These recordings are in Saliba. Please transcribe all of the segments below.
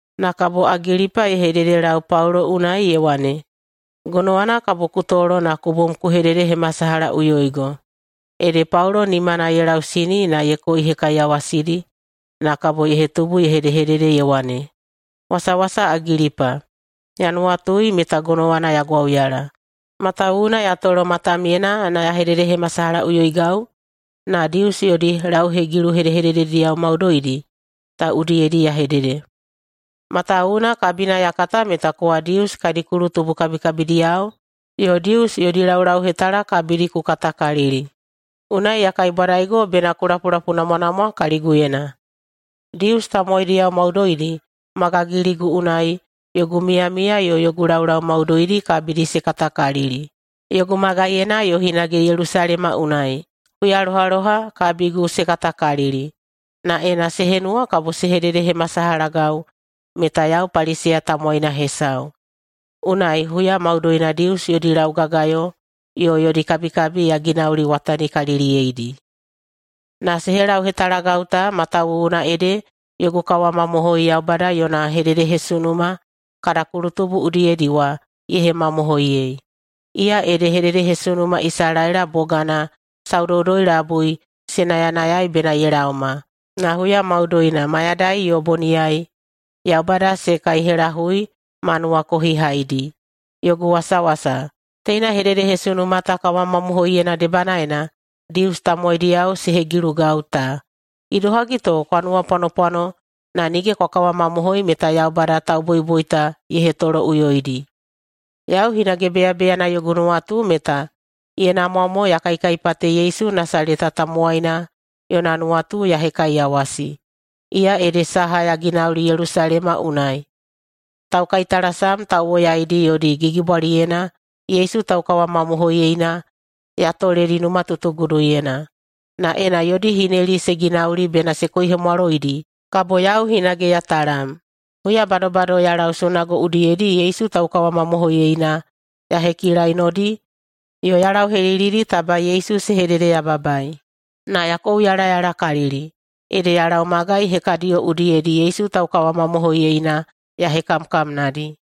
Na kabo Agilipa ye hededelau Paulo unai ye wane, “Gonowana kabo ku tolo na ku bom ku hededehemasalahaꞌuyoigo.” Ede Paulo nimana ye lausini na ye koihekaiyawasidi na kabo ye hetubu ye hedehedede ye wane, “Wasawasa Agilipa! Ya nuwatui meta gonowana ya gwauyala, matawuwuna ya tolo matamyena na ya hededehemasalahaꞌuyoigau na Dius yodi lauhegilu hedehededediyao maudoidi ta udiyedi ya hedede. Matawuwuna kabina ya kata meta kowa Dius kadi kulutubu kabikabidiyao yo Dius yodi laulauhetala kabidi ku katakalili. Unai ya kaibwadaigo bena ku lapulapuinamwanamwa kaliguyena. Dius tamowaidiyao maudoidi ma gagiligu unai yogu miyamiya yo yogu laulau maudoidi kabidi se katakalili, yogu magaiyena yo hinage Yelusalema unai. Huyalohaloha kabigu se katakalili, na ena se henuwa kabo se hededehemasalahagau meta yau Paliseya tamowaina hesau, unai huya maudoina Dius yodi laugagayo yo yodi kabikabi ya ginauliwatanikaliliyeidi. Na se helauhetalagau ta matawuwuna ede yogu kawamamohoi Yaubada yona hededehesunuma kada kulutubu udiyedi wa ye hemamohoiyei. Iya ede hededehesunuma Isalaela bogana saudoudoi-labui se nayanayai bena ye laoma, na huya maudoina, mayadai yo boniyai, Yaubada se kaihelahui ma nuwakohihaidi. Yogu wasawasa, teina hededehesunuma ta kawamamohoiyena debanaena Dius tamowaidiyao se hegilugau ta. Idohagi to kwa nuwapwanopwano na nige kwa kawamamohoi meta Yaubada tauboiboita ye hetoloꞌuyoidi? Yau hinage beyabeyana yogu nuwatu meta ye namwa mo ya kaikaipate Yesu Nasaleta tamowaina yona nuwatu ya hekaiyawasi. Iya ede saha ya ginauli Yelusalema unai. Taukaitalasam tauwoyaidi yodi gigibwaliyena Yesu taukawamamohoiyeina ya toledi numatutuguduyena, na ena yodi hineli se ginauli bena se koihemwaloidi, kabo yau hinage ya talam. Huya badobado ya lau sunago udiyedi Yesu taukawamamohoiyeina ya hekilainodi yo ya lauhelilidi taba Yesu se hededeyababai. Na ya kouyalayalakalili, ede ya lau magai hekadiyo udiyedi Yesu taukawamamohoiyeina ya hekamkamnadi.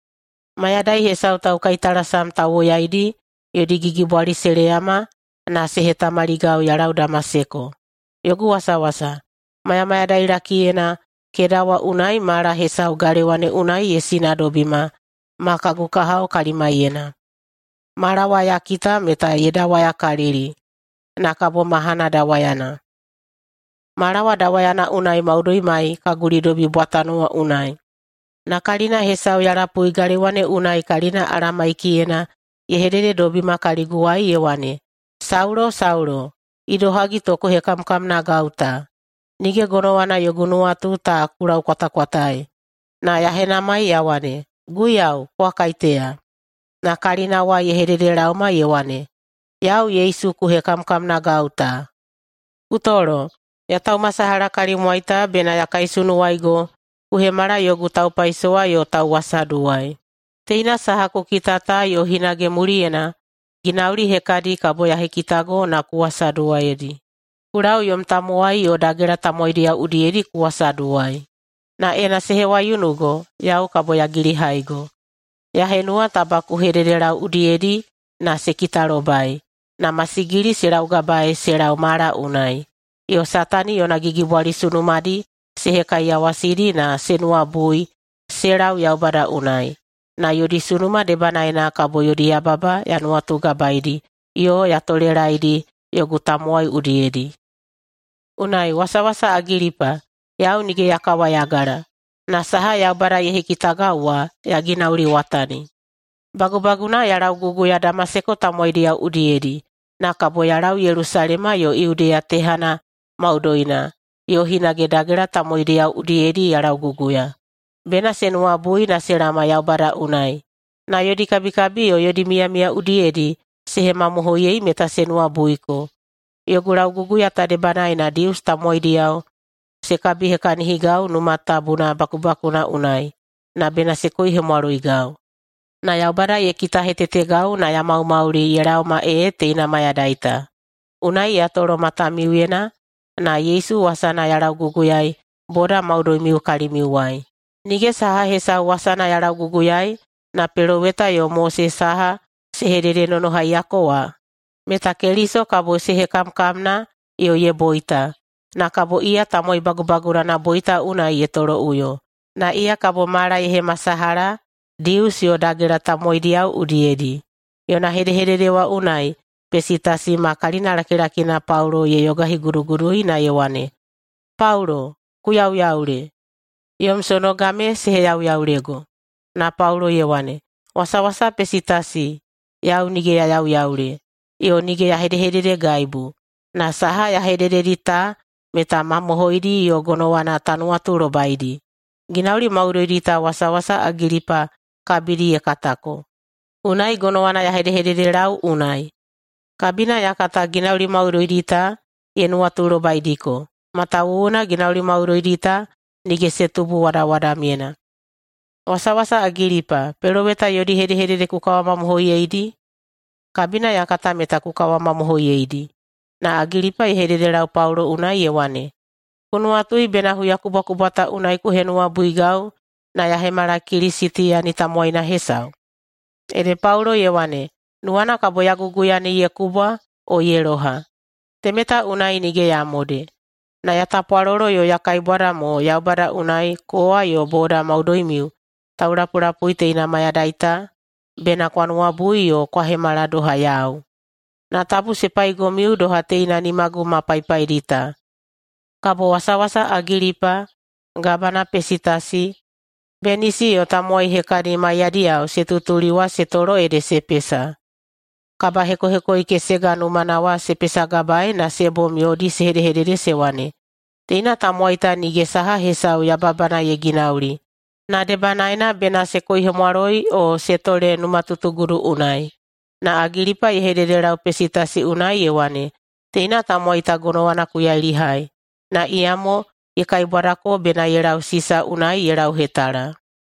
Mayadai hesau taukaitalasam tauwoyaidi yodi gigibwali se leyama na se hetamaligau ya lau Damaseko. Yogu wasawasa, mayamayadailakiyena keda wa unai mala hesau galewa ne unai ye sinadobima ma kagu kahao kalimaiyena. Mala wa ya kita meta ye dawayakalili na kabo mahana dawayana. Mala wa dawayana unai maudoimai ka gulidobi bwatano wa unai, na kalina hesau ya lapui galewa ne unai kalina Alamaikiyena ye hedehedededobima kaliguwai ye wane, ‘Saulo, Saulo! Idohagi to ku hekamkamnagau ta? Nige gonowana yogu nuwatu ta ku laukwatakwataei.’ Na ya henamai ya wane, ‘Guiyau, kowa kaiteya?’ Na kalina wa ye hededelaoma ye wane, ‘Yau Yesu ku hekamkamnagau ta. Ku tolo! Ya taumasalaha kalimwai ta bena ya kaisunuwaigo ku hemala yogu taupaisowa yo tauwasaduwai, teina saha ku kita ta yo hinage muliyena ginauli hekadi kabo ya hekitago na ku wasaduwaiyedi. Ku lau yom tamowai yo dagela tamowaidiyao udiyedi ku wasaduwai. Na ena se hewaiunugo, yau kabo ya gilihaigo. Ya henuwa taba ku hededelau udiyedi na se kitalobai, na masigili se laugabae se lau mala unai, yo Satani yona gigibwali sunumadi se hekaiyawasidi na se nuwabui se lau Yaubada unai. Na yodi sunuma debanaena kabo yodi yababa ya nuwatugabaedi yo ya tolelaedi yogu tamowai udiyedi.’ Unai, wasawasa Agilipa, yau nige ya kawayagala, na saha Yaubada ye hekitagau wa ya ginauliwatani. Bagubaguna ya lauguguya Damaseko tamowaidiyao udiyedi, na kabo ya lau Yelusalema yo Yudeya tehana maudoina, yo hinage dagela tamowaidiyao udiyedi ya lauguguya, bena se nuwabui na se laoma Yaubada unai, na yodi kabikabi yo yodi miyamiya udiyedi se hemamohoiyei meta se nuwabuiko. Yogu lauguguya ta debanaena Dius tamowaidiyao se kabihekahinigau Numa Tabuna bakubakuna unai, na bena se koihemwaloigau. Na Yaubada ye kitahetetegau na ya maumauli ye laoma ee teina mayadai ta. Unai ya tolo matamiuyena na Yesu wasana ya lauguguyaei boda maudoimiu kalimiuwai. Nige saha hesau wasana ya lauguguyaei na Peloweta yo Mose saha se hededenonohaiyako wa, meta Keliso kabo se hekamkamna yo ye boita, na kabo iya tamowai bagubagunana boita unai ye toloꞌuyo, na iya kabo mala ye hemasalaha Dius yo dagela tamowaidiyao udiyedi.” Yona hedehedede wa unai Pesitasi ma kalinalakilakina Paulo ye yogahigudugudui na ye wane, “Paulo, ku yauyaule! Yom sonoga me se heyauyaulego.” Na Paulo ye wane, “Wasawasa Pesitasi, yau nige ya yauyaule yo nige ya hedehededegaibu. Na saha ya hedededi ta meta mamohoidi yo gonowana ta nuwatulobaidi. Ginauli maudoidi ta wasawasa Agilipa kabidi ye katako, unai gonowana ya hedehededelau unai. Kabina ya kata ginauli maudoidi ta ye nuwatulobaidiko, matawuwuna ginauli maudoidi ta nige se tubu wadawadamyena. Wasawasa Agilipa, peloweta yodi hedehedede ku kawamamohoiyeidi? Kabina ya kata meta ku kawamamohoiyeidi.” Na Agilipa ye hededelau Paulo unai ye wane, “Ku nuwatui bena huyakubwakubwa ta unai ku henuwabuigau na ya hemala Kilisitiyani tamowaina hesau?” Ede Paulo ye wane, “Nuwana kabo ya guguya ne ye kubwa o ye loha, temeta unai nige ya mode. Na ya tapwalolo yo ya kaibwada mo Yaubada unai kowa yo boda maudoimiu taulapulapui teina mayadai ta, bena kwa nuwabui yo kwa hemala doha yau, na tabu se paigomiu doha teina nimagu ma paipaidi ta.” Kabo wasawasa Agilipa, gabana Pesitasi, Benisi, yo tamowai hekadi maiyadiyao se tutuli wa se tolo ede se pesa. Kabahekohekoikesega numana wa se pesagabaei na se bom yodi se hedehedede se wane, “Teina tamowai ta nige saha hesau yababana ye ginauli na debanaena bena se koihemwaloi o se tole numatutugudu unai.” Na Agilipa ye hededelau Pesitasi unai ye wane, “Teina tamowai ta gonowana ku yailihai, na iyamo ye kaibwadako bena ye lau Sisa unai ye lauhetala.”